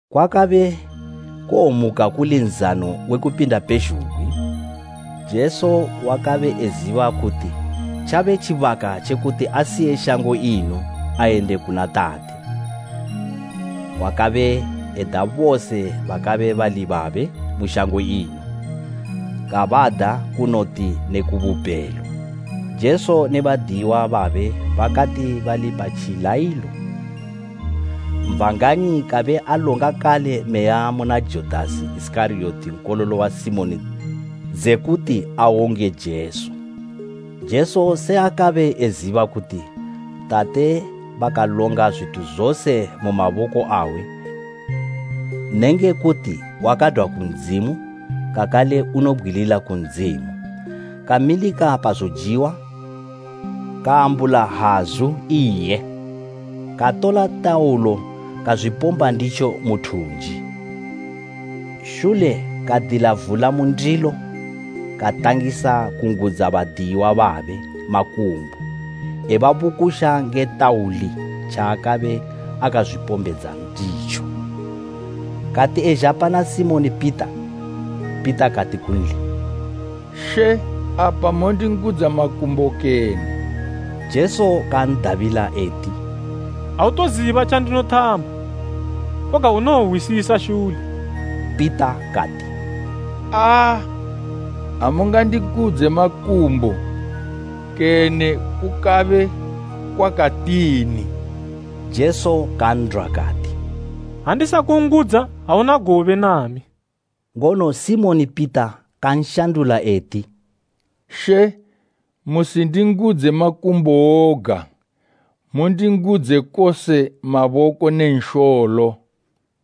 Kwakabe kuwomuka kuli Nzano we Kupinda pezhugwi. Jesu wakabe eziba kuti tjabe tjibaka tje kuti asiye shango ino ayende kuna Tate. Wakabe eda bose bakabe bali babe mu shango ino, kabada kunoti ne ku bupelo. Jesu ne badiyiwa babe bakati bali pa tjilayilo, Satani kabe alonga kale meya muna Judasi Isikariyoti nkololo wa Simoni dzekuti awonge Jesu. Jesu se akabe eziba kuti Tate bakalonga zwithu zose mu maboko awe nenge kuti wakadwa ku Ndzimu kakale unowobgwilila ku Ndzimu, kamilika pa zojiwa, kaambula hazu iye, katola tauli kazwipomba nditjo mu thunji. Shule, kadila vula mu ndilo katangisa kungudza badiyiwa babe makumbo ebabukusha nge tauli tjaakabe akazwipombedza nditjo. Kati ezha pana Simoni Pita, Pita kati kunli, “She apa mondingudza makumbo kene?” Jesu kan'dabila eti, “Autoziba tjandinothama, koga unowohwisisa shule.” Pita kati, “Aa, amungandingudze makumbo kene kukabe kwakatini.” Jesu kan'dwa kati, “Ha ndisakungudza auna gobe nami.” Ngono Simoni Pita kanshandula eti, “She, musindingudze makumbo woga, mundingudze kose maboko ne nsholo!”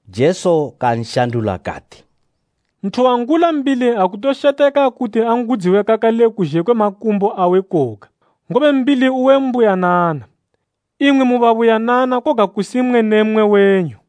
Jesu kanshandula kati, “Nthu wangula mbili akutosheteka kuti angudziwe kakale kuzhe kwe makumbo awe koga, ngobe mbili uwe mbuyanana. Imwi mu babuyanana koga kusi mmwe ne mmwe wenyu.”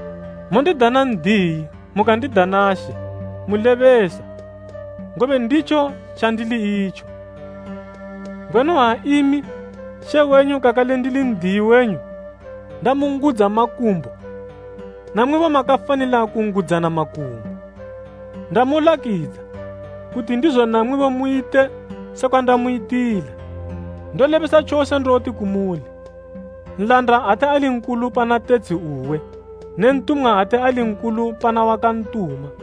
Mondidana ‘N'diyi’ mukandidana ‘She’ mulebesa, ngobe nditjo tjandili itjo. Ngwenu ha imi, She wenyu kakale ndili N'diyi wenyu ndamungudza makumbo, namwibo makafanila kungudzana makumbo. Ndamulakidza, kuti ndizo namwibo muyite sekwa ndamuyitila. Ndolebesa tjose ndoti kumuli, nlanda ate ali nkulu pana tetshi uwe ne ntumwa ate ali nkulu pana wakantuma.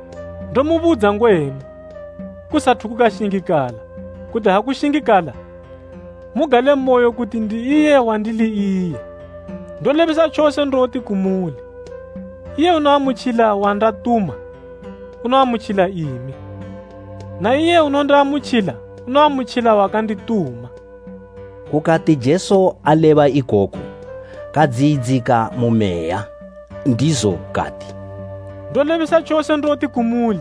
Ndomubudza ngwenu, kusathu kukashingikala, kuti ha kushingikala, mugalemoyo kuti ‘Ndi iye wandili iye.’ Ndolebesa tjose ndoti kumuli, iye unoamutjila wandatuma, unoamutjila imi, na iye unondiamutjila unoamutjila wakandituma.” Kukati Jesu aleba ikoku, kadziyidzika mu meya, ndizo kati, “Ndolebesa tjose ndoti kumuli,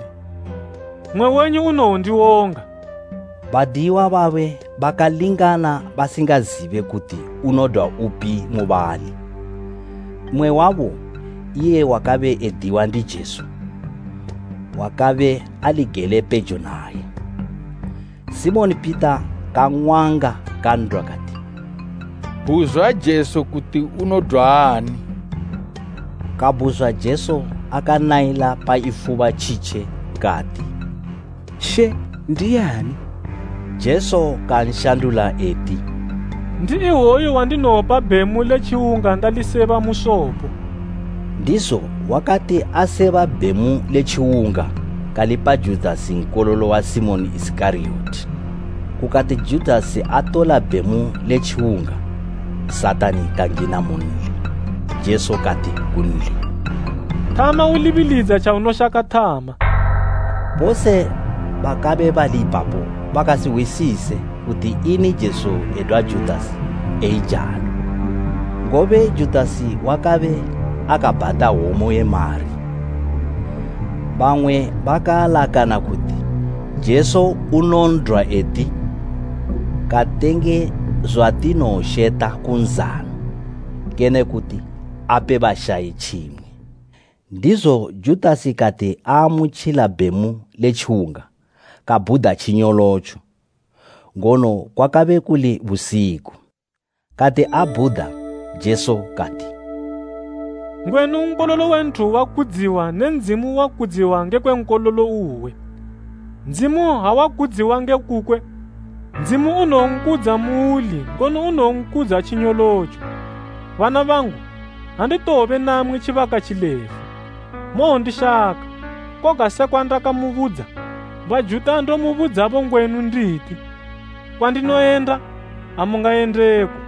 mmwe wenyu unowondiwonga.” Badiyiwa babe bakalingana basingazibe kuti unodwa upi mubali. Mmwe wabo, iye wakabe ediwa ndi Jesu, wakabe ali gele pejo naye. Simoni Pita kang'wanga kan'dwa kati, “Bhuzwa Jesu kuti unodwa ani.” Kabhuzwa Jesu akanayila pa ifuba tjitje kati, “She, ndiani?” Jesu kanshandula eti, “Ndi iwoyu wandinowopa bhemu le tjiwunga ndaliseba mu sopo.” Ndizo wakati aseba bhemu le tjiwunga kalipa Judasi nkololo wa Simoni Isikariyoti. Kukati Judasi atola bhemu le tjiwunga, Satani kangina munli. Jesu kati kunli, “Thama ulibilidza tjaunoshaka thama.” Bose bakabe bali ipapo bakasihwisise kuti ini Jesu edwa Judasi eijalo. Ngobe Judasi wakabe akabhata hwomo ye mari, bamwe bakaalakana, kuti Jesu unon'dwa eti, “Katenge zwatinowosheta ku nzano,” kene kuti ape bashayi tjimwe. Ndizo Judasi kati aamutjila bhemu le tjiwunga, kabhuda tjinyolotjo; ngono kwakabe kuli busiku. Kati abhuda, Jesu kati, “Ngwenu Nkololo we Nthu wakudziwa, ne Ndzimu wakudziwa ngekwe Nkololo uwe. Ndzimu ha wakudziwa nge kukwe, Ndzimu unowonkudza muuli ngono unowonkudza tjinyolotjo. Bana bangu, anditowobe namwi tjibaka tjilefu. Mowondishaka, koga sekwa ndakabudza Bajuta ndomubudzabo ngwenu nditi, ‘Kwandinoyenda, amungayendeko.’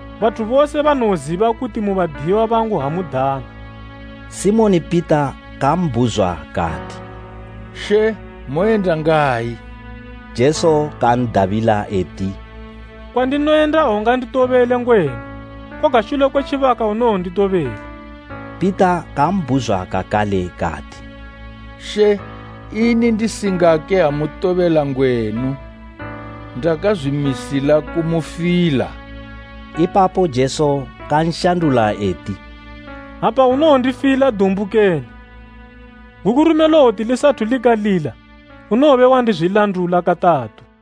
Bathu bose banowoziba kuti mu badiyiwa bangu ha mudana.” Simoni Pita kambhuzwa kati, “She, moyenda ngayi?” Jesu kan'dabila eti, “Kwandinoyenda aunganditobele ngwenu; koga shule kwe tjibaka unowonditobela.” Pita kambhuzwa kakale kati, “She, ini ndisingake amotobela ngwenu? Ndakazwimisila kumufila.” Ipapo Jesu, kanshandula eti, “Apa unowondifila dumbu kene? Gukurume lowoti lisathu likalila, unowobe wandizwilandula katatu!”